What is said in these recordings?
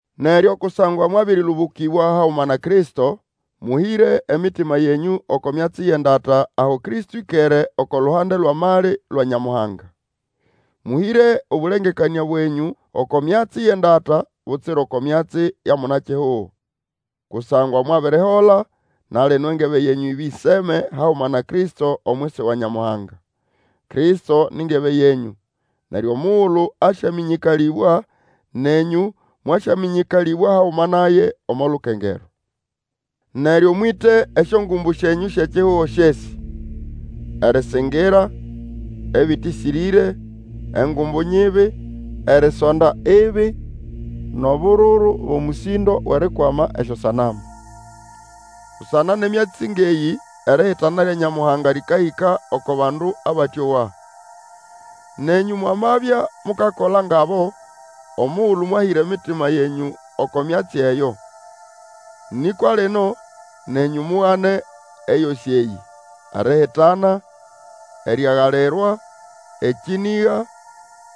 Neryo kusangwa mwabĩrĩlũbũkĩbwa haguma na Kristo, mũhĩre emitima yenyũ oko myatsi yʼendata aho Kristo ĩkere oko luhande lwʼamali lwa Nyamuhanga. Mũhĩre obũlengekanĩa bwenyũ oko myatsi yʼendata, butsira oko myatsi ya muna-kihugo. Kusangwa mwabirihola, na lino engebe yenyũ ĩbĩseme haguma na Kristo omwisi wa Nyamuhanga. Kristo ni ngebe yenyũ, neryo omugulu asyamĩnyĩkalĩbwa nenyũ mwasyamĩnyĩkalĩbwa haguma naye omo lukengerwa. Neryo mwĩte esyongumbu syenyũ syʼekihugo, syesĩ: erĩsĩngĩra, ebĩtĩsĩrĩre, engumbu nyibi, erisonda ibi, nʼobururu bʼomũsĩndo wʼerikwama esyosanamu. Busana nʼemyatsi ngʼeyĩ erihitana lya Nyamuhanga lĩkahĩka oko bandu abatĩowa. Nenyũ momwabya mukakola ngʼabo, omugulu mwahĩra emitima yenyũ, oko myatsi eyo. Nĩkwa lino, nenyũ mugane eyosĩ eyĩ: erihitana, eriagalirwa, ekĩnĩga,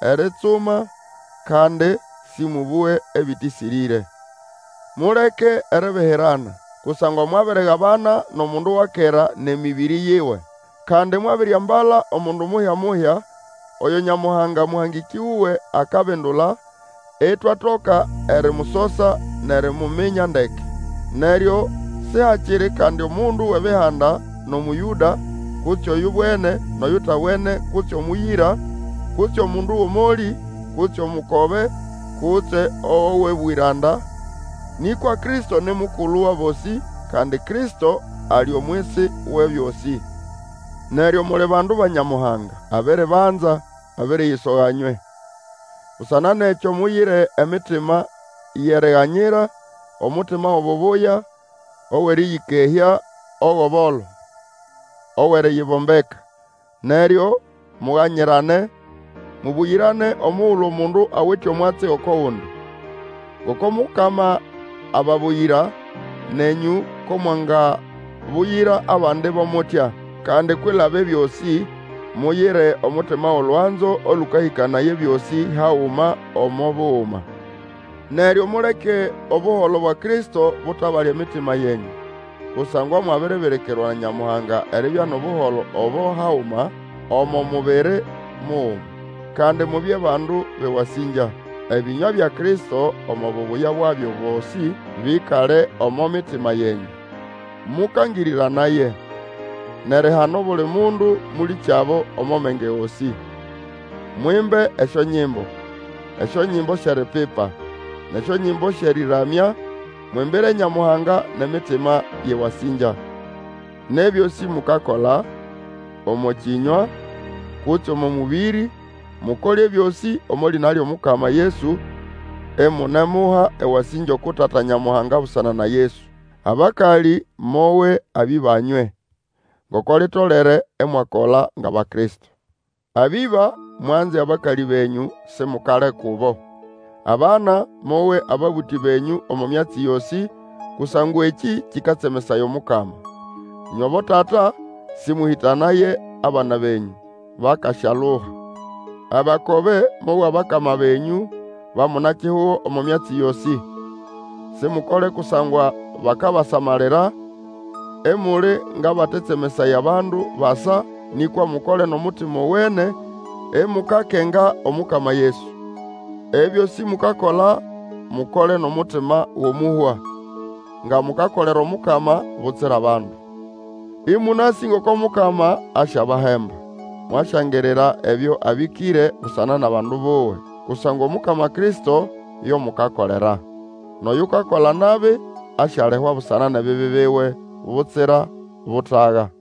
eritsuma; kandi Sĩmũbũge ebĩtĩsĩrĩre. Muleke eribihirana, kusangwa mwabirigabana nʼomundu wa kera nʼemĩbĩrĩ yiwe. Kandi mwabiriambala omundu muhya-muhya, oyo Nyamuhanga, mũhangĩkĩ wuwe akabindula, itwatoka erimusosa nʼerimuminya ndeke. Neryo sihakiri kandi omundu wʼEbihanda nʼOmũyũda, kutse oyubwene nʼoyutabwene kutse omũyĩra, kutse mundu wʼomolĩ, kutse omukobe, kutse owʼobwĩranda, nĩkwa Kristo ni mukulu wʼabosĩ, kandi Kristo ali omwisi Wʼebyosĩ. Neryo muli bandu ba Nyamuhanga. Abiribanza, abiriyisoga nywe. Busana nʼekyo muyire emitima yʼeriganyira, omutima wʼobubuya, owʼerĩyĩkehya, owʼobolo, owʼeriyibombeka. Neryo muganyirane, mubuyirane omugulu omundu awite omwatsi oko gundi. Ngoko Mukama ababuyira, nenyũ ko mwangabuyira abandi bo mutya. Kandi kwilaba ebyosĩ, muyire omutima wʼolwanzo olũkahĩkanaya ebyosĩ haguma omo buguma. Neryo muleke Obuholo bwa Kristo butabale emitima yenyũ. Kusangwa mwabiribirikirwa na Nyamuhanga eribya nʼobuholo obo haguma, omo mubiri muguma. Kandi mubye bandu bʼewasĩngya. Ebĩnywa bya Kristo, omo bubuya bwabyo bosĩ, bĩkale omo mitima yenyũ. Mũkangĩrĩranaye, nʼerihana obuli mundu mũlĩkyabo omo menge gosĩ. Mwimbe esyonyimbo, esyonyimbo syʼeripipa, nʼesyonyimbo syʼerĩramya, mwimbire Nyamuhanga nʼemitima yʼewasĩngya. Nʼebyosĩ mukakola, omo kĩnywa, kutse omo mũbĩrĩ, mukole ebyosĩ omo lĩna lyʼomukama Yesu, imunemuha ewasĩngya uku Tata Nyamuhanga busana na Yesu. Abakalĩ, mowe abĩba nywe, ngoko litolere imwakola ngʼAbakristo. Abĩba, mwanze abakalĩ benyũ, simukale kubo. Abana, mowe ababũtĩ benyũ omo myatsi yosĩ, kusangwa ekĩ kĩkatsemesaya Omukama. Ĩnywe abotata, sĩmũhĩtanaye abana benyũ, bakasyaluha. Abakobe, mowe abakama benyũ ba muna-kihugo omo myatsi yosĩ. Simukole kusangwa bakabasamalira, imuli ngʼabakatsemesaya abandu basa, nĩkwa mukole nʼomutima owene, imukakenga Omukama Yesu. Ebyosĩ mukakola, mukole nʼomutima gʼomuhwa, nga mukakolera Omukama, butsira bandu. Ĩmũnasĩ ngoko Mukama asyabahemba. Mwasyangirira ebyo abĩkĩre busana nʼabandu buwe. Kusangwa Omukama Kristo, yo mukakolera. Nʼoyukakola nabi asyalihwa busana nʼebibi biwe, butsira butaga.